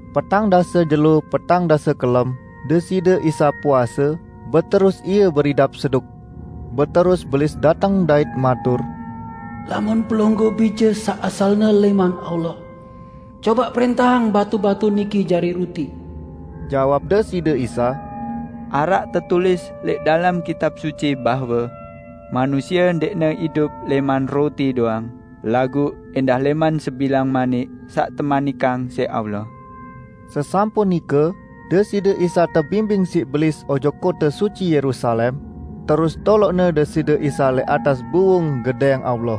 Petang dase jelo petang dase kelem Deside Isa puase beterus Ie beridap seduk. Beterus Belis dateng dait matur, "Lamun Pelungguh Bije saq asalne lẽman Allah, cobaq prẽntahang batu-batu niki jari ruti." Jawab Deside Isa, "Araq tetulis lẽq dalem Kitab Suci bahwe: Manusie ndẽqne idup lẽman ruti doang, laguq ẽndah lẽman sebilang manik saq temanikang siq Allah." Sesampun nike, Deside Isa tebimbing siq Belis ojok kote suci Yerusalem, terus toloqne Deside Isa lẽq atas buwung Gedẽng Allah.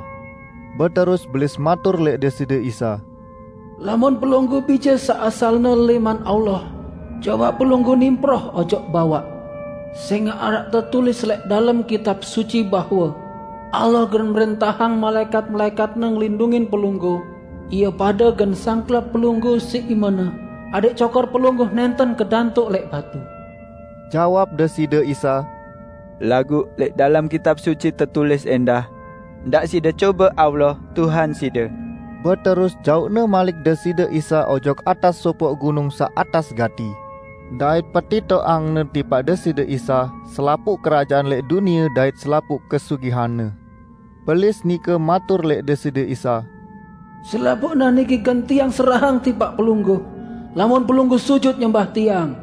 Beterus Belis matur lẽq Deside Isa, "Lamun Pelungguh Bije saq asalne lẽman Allah, cobaq Pelungguh nimproh ojok bawaq. Sẽngaq araq tetulis lẽq dalem Kitab Suci bahwe, 'Allah gen mrẽntahang malaẽkat-malaẽkat-Ne ngelindungin Pelungguh, ie pade gen sangklap Pelungguh siq imene, adẽq cokor Pelungguh nẽnten kedantuk lẽq batu.' " Jawab Deside Isa, "Laguq lẽq dalem Kitab Suci tetulis ẽndah, 'Ndaq side cobe Tuhan Allah side!' " Beterus jauqne malik Deside Isa ojok atas sopoq gunung saq atas gati, dait petitoqangne tipaq Deside Isa selapuq kerajaan lẽq dunie dait selapuq kesugihanne. Belis nike matur lẽq Deside Isa, "Selapuqne niki gen tiang serahang tipaq Pelungguh lamun Pelungguh sujut nyembah tiang."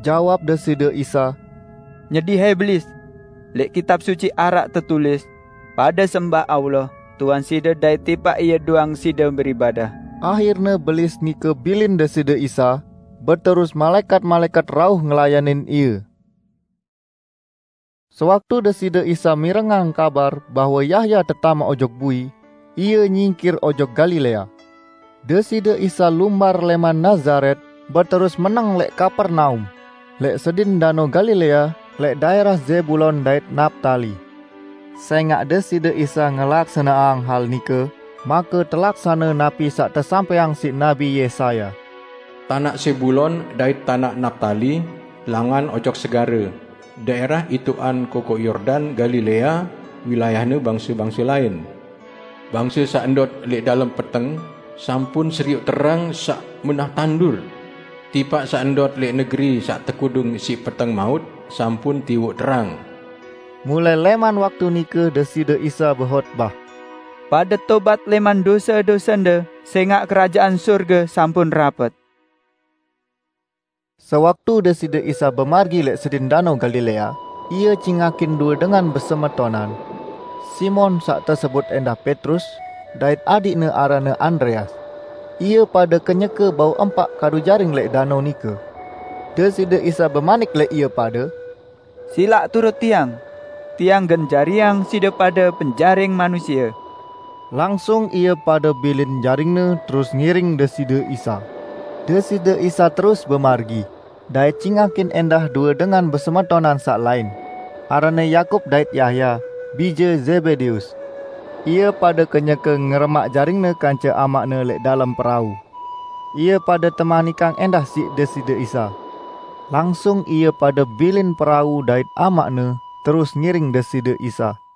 Jawab Deside Isa, "Nyedi hai Belis! Lẽq Kitab Suci araq tetulis: Pade sembah Tuhan Allahde dait tipaq Ie doang side beribadah!" Ahirne Belis nike bilin Deside Isa, beterus malaẽkat-malaẽkat rauh ngelayanin Ie. Sewaktu Deside Isa mirengang kabar bahwe Yahya tetamaq ojok bui, Ie nyingkir ojok Galilea. Deside Isa lumbar lẽman Nazaret beterus meneng lẽq Kapernaum, lẽq sedin Danao Galilea lẽq daẽrah Zebulon dait Naptali. Sẽngaq Deside Isa ngelaksaneang hal nike, make telaksane napi saq tesampẽang siq Nabi Yesaya: "Tanaq Zebulon dait tanaq Naptali, langan ojok segare, daẽrah itoqan Kokoq Yordan, Galilea, wilayahne bangse-bangse lain! Bangse saq endot lẽq dalem peteng, sampun serioq Terang saq menah tandur! Tipaq saq endot lẽq negeri saq tekudung siq peteng maut sampun tiwoq Terang!" Mulai lẽman waktu nike Deside Isa behotbah, "Pade tobat lẽman dose-dosende, sẽngaq Kerajaan Sorge sampun rapet!" Sewaktu Deside Isa bemargi lẽq sedin Danao Galilea, Ie cingakin due dengan besemetonan, Simon (saq tesebut ẽndah Petrus) dait adiqne aranne Andreas. Ie pade kenyeke bau empaq Kadu jaring lẽq danao nike. Deside Isa bemanik lẽq ie pade, "Silaq turut Tiang, Tiang gen jariang side pade penjaring manusie." Langsung deduaqne bilin jaringne terus ngiring Deside Isa. Deside Isa terus bemargi, dait cingakin ẽndah due dengan besemetonan saq lain, aranne Yakub dait Yahya bije Zebedeus. Ie pade kenyeke ngeremaq jaringne kance amaqne lẽq dalem perau. Ie pade temanikang ẽndah siq Deside Isa, langsung ie pade bilin perau dait amaqne terus ngiring Deside Isa.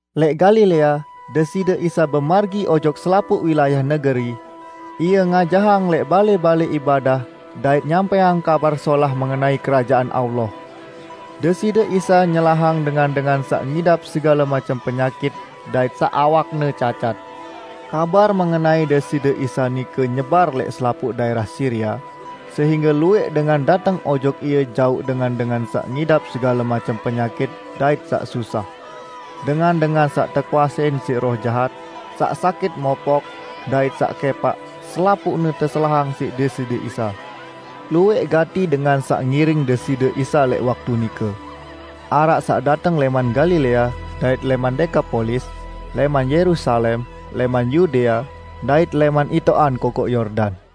Lẽq Galilea Deside Isa bemargi ojok selapuq wilayah negeri; Ie ngajahang lẽq balẽ-balẽ ibadah dait nyampẽang Kabar Solah mengenai Kerajaan Allah. Deside Isa nyelahang dengan-dengan saq ngidap segale macem penyakit dait saq awakne cacat. Kabar mengenai Deside Isa nike nyebar lẽq selapuq daẽrah Siria, sehingge luwẽq dengan dateng ojok Ie jauq dengan-dengan saq ngidap segale macem penyakit dait saq susah. Dengan-dengan saq tekuasein siq roh jahat, saq sakit mopok, dait saq kẽpaq, selapuqne teselahang siq Deside Isa. Luwẽq gati dengan saq ngiring Deside Isa lẽq waktu nike. Araq saq dateng lẽman Galilea dait lẽman Dekapolis, lẽman Yerusalem, lẽman Yudea, dait lẽman itoqan Kokoq Yordan.